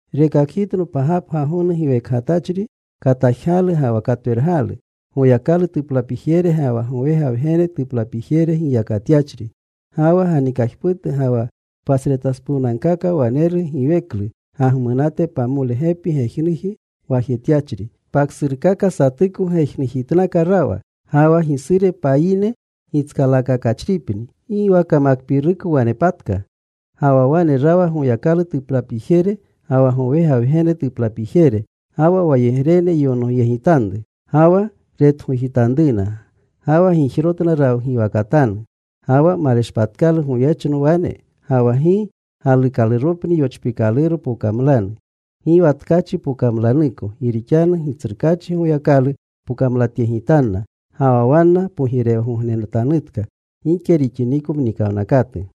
Rekakgitno pagapga gonu giwekgatachri, katajgalu ga wa katwergalu. Goyakalu tuplapijere ga wa gowega Wgene tuplapijere giyakgatyachri. Ga wa ganikajputu ga wa pasretaspuwnagkaka waneru giweklu gagmunate, pamole gepi gejnuji gwajetyachri, paksurkaka satuko gejnujitnaka rawa. Ga wa gisure payine gitskalaakakachripni. Gi wa kamakpiiruko wanepatka. Ga wa wane rawa Goyakalu tuplapijere, ga wa gowega Wgene tuplapijere. Ga wa wayegrene yonogyegitanru. Ga wa retgojitanruna. Ga wa gijrotna rawgiwakatanu. Ga wa maleshpatkalu goyechno wane. Ga wa gi galuukaluropni yochpiikaluro pokamlanu. Gi wa tkachi pokamlanuko. Gi rixanu Gitsrukaachi Goyakalu pokamlatyegitanna. Ga wa wanna pogirewgognenatanutka gike rixiniko mnikawnakatu.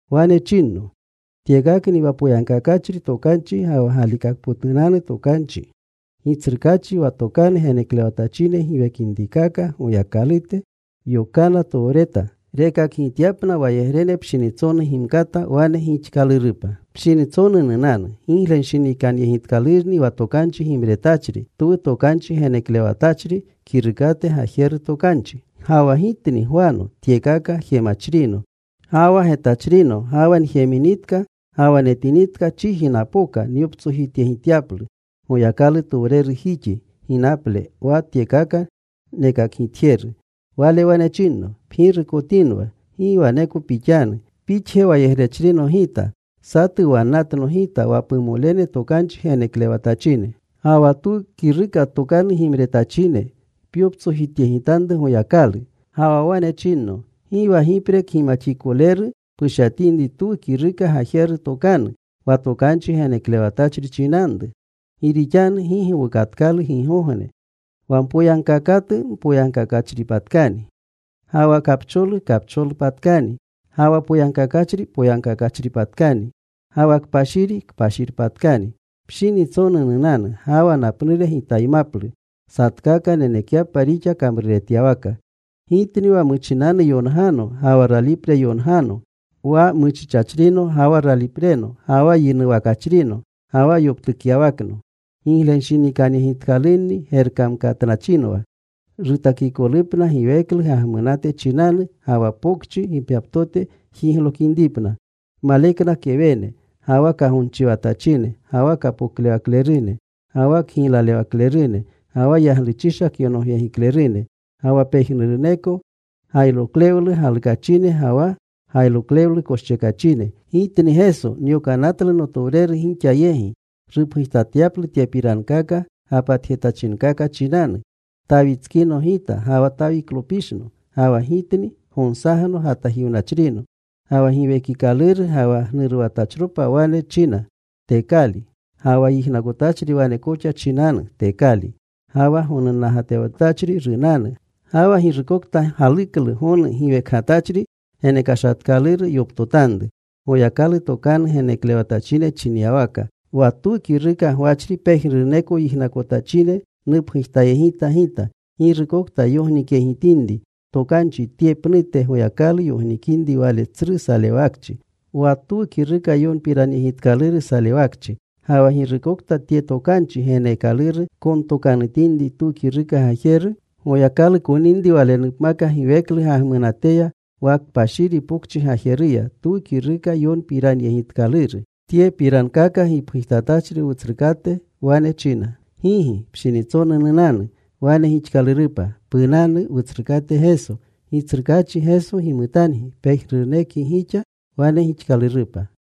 Wane chinno, “Tyekakni wa poyagkakachri tokanchi ga wa galikakpotunanu tokanchi. Gitsrukaachi wa tokanu geneklewatachine giwekinrikaka Goyakalute, yokana towreta rekakgityapna wayegrene pshinitsonu gimkata wane gixkalurkakapa. “Pshinitsonu nunanu. Giglenshinikanyegitkalurni wa tokanchi gimretachri twu tokanchi geneklewatachri kirukate gajeru tokanchi.” Ga wa gitni Gwano tyekaka jemachrino ga wa getachrino, ga wa njeminitka ga wa netinitka, chiji napoka nyoptsojityegityaplu Goyakalutowrerujixi ginaple, wa tyekaka nekakgitjeru. Wale wane chinno, “Pgirukotinwa. Gi waneko pixanu. Pixje wayegrechrino gita. Satu wannatno gita, wa pumolene tokanchi geneklewatachine, ga wa twu kiruka tokanu gimretachine. Pyoptsojityegitanru Goyakalu.” Ga wa wane chinno, “Gi wa gipre kgimaxikoleru pushyatinri twu kiruka gajeru tokanu, wa tokanchi geneklewatachri chinanru. Gi rixanu gi gowukatkalu gigogne. Wa mpoyagkaakatu mpoyagkaakatpatkani. Ga wa kapcholu kapcholpatkani. Ga wa poyagkakachri poyagkakpatkani. Ga wa kpashiri kpashirpatkani.” “Pshinitsonu nunanu. Ga wa napnure Gitaymaplu, satkaka nenekyapa rixa kamruretyawaka. Gitni wa muchinanu yongano ga wa ralipre yongano, wa muchichachrino ga wa ralipreno, ga wa yinuwakachrino ga wa yoptukyawakno. “Giglenshinikanyegitkalunni gerkamkatnachinwa, rutakikolupna giweklu gagmunate chinanu, ga wa pokchi gipgyaptote jiglokinripna. Malekna kewene, ga wa kagonchiwatachine, ga wa kapoklewaklerune, ga wa kgiylalewaklerune, ga wa yagluchisha kyonogyegiklerune, ga wa pejnuruneko gayroklewlu galukachine ga wa gayroklewlu koschekachine. “Gitni Geso nyokanatlu notowreru gixa yegi rupgujtatyaplu tyepirankaka gapatjetachinkaka chinanu. Tawitskino Gita, ga wa Tawiklopishno. Ga wa Gitni Gonsagno gatajiwnachrino.” Ga wa Giwekikaluru ga wa gnuruwatachropa wane china, “Tekali.” Ga wa yijnakotachri wane koxa chinanu, “Tekali.” Ga wa gonunnagatewatachri runanu. Ga wa girukokta galuklu gonu giwekgatachri genekashatkaluru yoptotanru. Goyakalu tokanu geneklewatachine chinyawaka, wa twu kiruka gwachri, pejnuruneko yijnakotachine nupgujtayegita gita. Girukokta yognikyegitinri tokanchi tye pnute, Goyakalu yognikinri wale tsru salewakchi, wa twu kiruka yonpiranyegitkaluru salewakchi. Ga wa girukokta tye tokanchi geneekaluru kontokanutinri twu kiruka gajeru, Goyakalu koninri walenupmaka giweklu gagmunateya wa kpashiri pokchi gajeruya, twu kiruka yonpiranyegitkaluru. Tyepirankaka gipgujtatachri Wutsrukate wane china, “Gigi. Pshinitsonu nunanu.” Wane gixkalurupa. Punanu, Wutsrukate Geso. Gitsrukaachi Geso gimutangi pejnurunekgi gixa. Wane gixkalurupa.